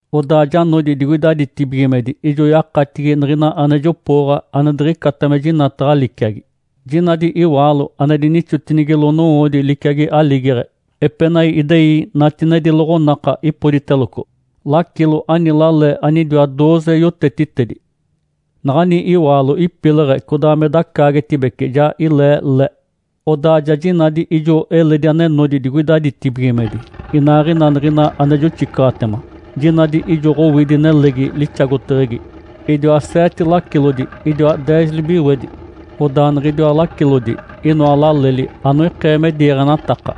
Odaa ja nodi digoida ditibigimedi ijo yakatigi niɡ̶ina ane jopooɡ̶a, ane diɡ̶icata me jinataɡ̶a liciagi. Jinadi iwaalo ane dinixotinigilo nowoodi liciagi aligeɡ̶e. Epenai idei natinedi loɡ̶onaka, ipoditeloco. Lacilo ani lale anidiwa dooze yotetitedi. Naɡ̶ani iwaalo ipileɡ̶e, codaa me dacaagetibece, ja ilee le. Odaa ja jinadi ijo eledi ane nodi digoida ditibigimedi, inaaɡ̶ina niɡ̶ina ane joxicaɡ̶atema. Jinadi ijo Ǥowidi nelegi lixagoteɡ̶egi. Idiwa seete lacilodi, idiaa deez libiwedi. Odaa niɡ̶idiwa lacilodi inoa laleli (anoikee me diiɡ̶enataka).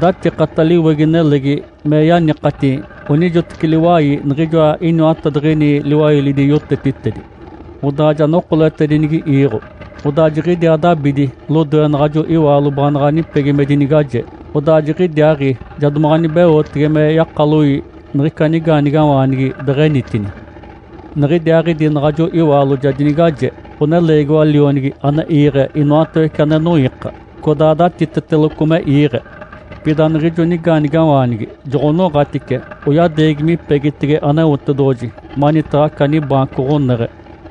Datikata liwegi nelegi me yanikati onijoteci liwai niɡ̶ijoa iniwatadiɡ̶ini liwailidi yotetitedi, odaa ja nokoletedinigi iiɡ̶o. Odaa jiɡ̶idiaa dabidi lodoe naɡ̶ajo iwaalo baanaɡ̶a nipegi me dinigaje. Odaa jiɡ̶idiaaɡ̶i ja domaɡ̶a nibeotege me yakaloi niɡ̶ica nigaanigawaanigi deɡ̶enitini. Niɡ̶idiaaɡ̶idi naɡ̶ajo iwaalo ja dinigaje, ɡ̶oneleegiwa lionigi ane iiɡ̶e inoatawece ane noiika, codaa datiteteloco me iiɡ̶e. Pida niɡ̶ijo nigaanigawaanigi joɡ̶onoɡ̶atice, oyadeegi mipegitege Aneotedoɡ̶oji, manitaɡ̶a aca nibaanco ɡ̶oneɡ̶e.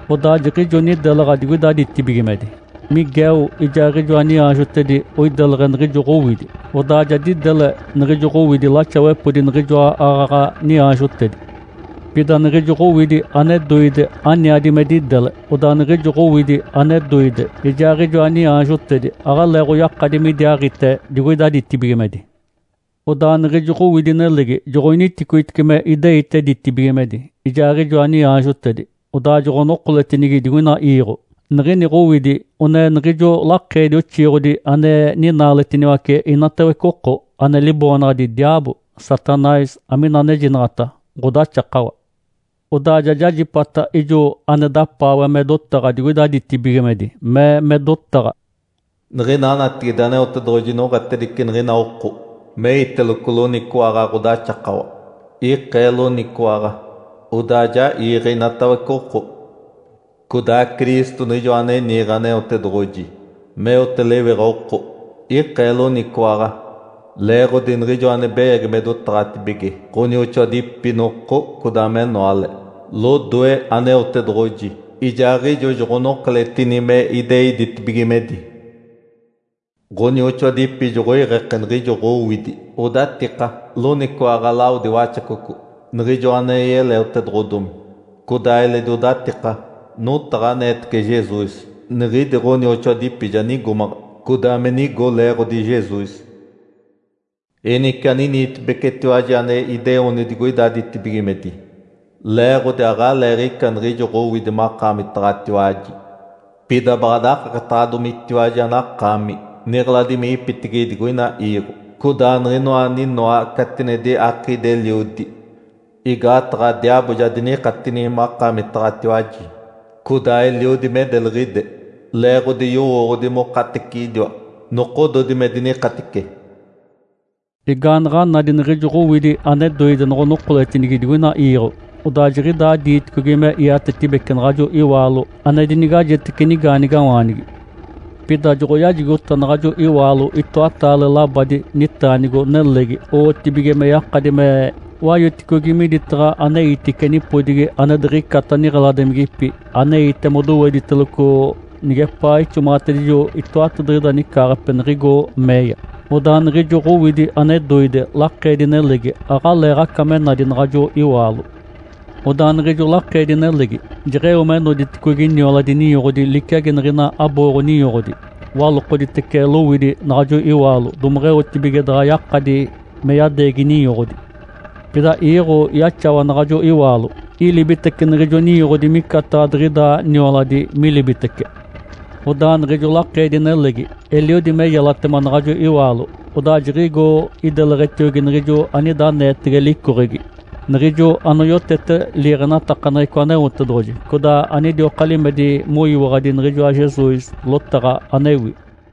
Odaa jiɡ̶ijo nidelaɡ̶a digoida ditibigimedi. Miguel ijaaɡ̶ijoa niaanjotedi oideleɡ̶e niɡ̶ijo Ǥowidi. Odaa ja didele niɡ̶ijo Ǥowidi laxawepodi niɡ̶ijoa aaɡ̶aɡ̶a niaanjotedi. Pida niɡ̶ijo Ǥowidi ane doide aniadi me didele. Odaa niɡ̶ijo Ǥowidi ane doide ijaaɡ̶ijoa niaanjotedi aɡ̶aleeɡ̶oyakadi midiaaɡ̶ite digoida ditibigimedi. Odaa niɡ̶ijo Ǥowidi nelegi joɡ̶oniticoitice me ideite ditibigimedi, ijaaɡ̶ijoa niaanjotedi. Odaa joɡ̶onokoletinigi digoina iiɡ̶o. Niɡ̶ini Ǥowidi one niɡ̶ijo lakeedi oxiiɡ̶odi ane ninaaletiniwace inatawece oko. Ane liboonaɡ̶adi diaabo, Satanás (amina anejinaɡ̶ata “Ǥodaxakawa”). Odaa ja jajipata ijo ane dapaawe me dotaɡ̶a digoida ditibigimedi, mee me dotaɡ̶a, “Niɡ̶ina natigide Aneotedoɡ̶oji noɡ̶atedice niɡ̶ina oko me iteloco loniciwaɡ̶a ɡ̶odaxakawa, ikee loniciwaɡ̶a, odaa ja iiɡ̶e inatawece oko. Codaa Cristo Niɡ̶ijoa ane niiɡ̶e Aneotedoɡ̶oji meote lewiɡ̶a oko, ikee loniciwaɡ̶a. Leeɡ̶odi niɡ̶ijo ane beyagi me dotaɡ̶atibige ɡ̶onioxoadipi noko codaa menoale lodoe Aneotedoɡ̶oji, ijaaɡ̶ijo joɡ̶onokoletini me idei ditibigimedi. Ǥonioxoadipi joɡ̶oiɡ̶eke niɡ̶ijo Ǥowidi odatika loniciwaɡ̶a lawodi Waxacoco (niɡ̶ijoa ane yeleotedoɡ̶odomi), codaa eledi odatika notaɡ̶a aneetece Jesus. Niɡ̶idi ɡ̶onioxoadipi ja nigomaɡ̶a codaa me nigo leeɡ̶odi Jesus. Enice aniniitibecetiwaji ane ideoni digoida ditibigimedi, leeɡ̶odi aɡ̶aleeɡ̶ica niɡ̶ijo Ǥowidi makaamitaɡ̶atiwaji! Pida baɡ̶a dakaketaɡ̶adomitiwaji anakaami niɡ̶eladimigipitigi digoina iiɡ̶o, codaa niɡ̶inoa aninoa catinedi akiidi-eliodi. Igaataɡ̶a diaabo ja dinikatini makaamitaɡ̶atiwaji, codaa eliodi me deliɡ̶ide, leeɡ̶odi yowooɡ̶odi mokateciɡ̶idiwa nokododi me dinikatice.” Igaanaɡ̶a nadi niɡ̶ijo Ǥowidi ane doide noɡ̶onokoletinigi digoina iiɡ̶o, odaa jiɡ̶idaa diiticogi me iatetibeci naɡ̶ajo iwaalo ane dinigajetece nigaanigawaanigi. Pida joɡ̶oyajigota naɡ̶ajo iwaalo itoataale labadi nitaanigo nelegi owotibige me yakadi me wayoticogi miditaɡ̶a aneitice, nipodigi ane diɡ̶icata niɡ̶eladimigipi, aneite modowediteloco nigepaa ixomaɡ̶atedijo itoatadiɡ̶ida nicaaɡ̶ape niɡ̶igo meeya. Odaa niɡ̶ijo Ǥowidi ane doide, lakeedi-nelegi aɡ̶aleeɡ̶aca me nadi naɡ̶ajo iwaalo. Odaa niɡ̶ijo lakeedi-nelegi jeɡ̶eo me noditicogi nioladi ninyoɡ̶odi liciagi niɡ̶ina abooɡ̶o-ninyoɡ̶odi walokoditece lowidi naɡ̶ajo iwaalo domeɡ̶eotibige daɡ̶a yakadi me yadeegi ninyoɡ̶odi. Pida iiɡ̶o yaxawa naɡ̶ajo iwaalo, ilibitece niɡ̶ijo ninyoɡ̶odi micataɡ̶a diɡ̶ida nioladi milibitece. Odaa niɡ̶ijo lakeedi-nelegi, eliodi me yelatema naɡ̶ajo iwaalo, odaa jiɡ̶igo ideleɡ̶etiogi niɡ̶ijo anida aneetege licoɡ̶egi, niɡ̶ijo anoyotete liiɡ̶enatakaneɡ̶eco Aneotedoɡ̶oji, codaa anidioka limedi moyiwaɡ̶adi niɡ̶ijoa Jesus lotaɡ̶a anewi.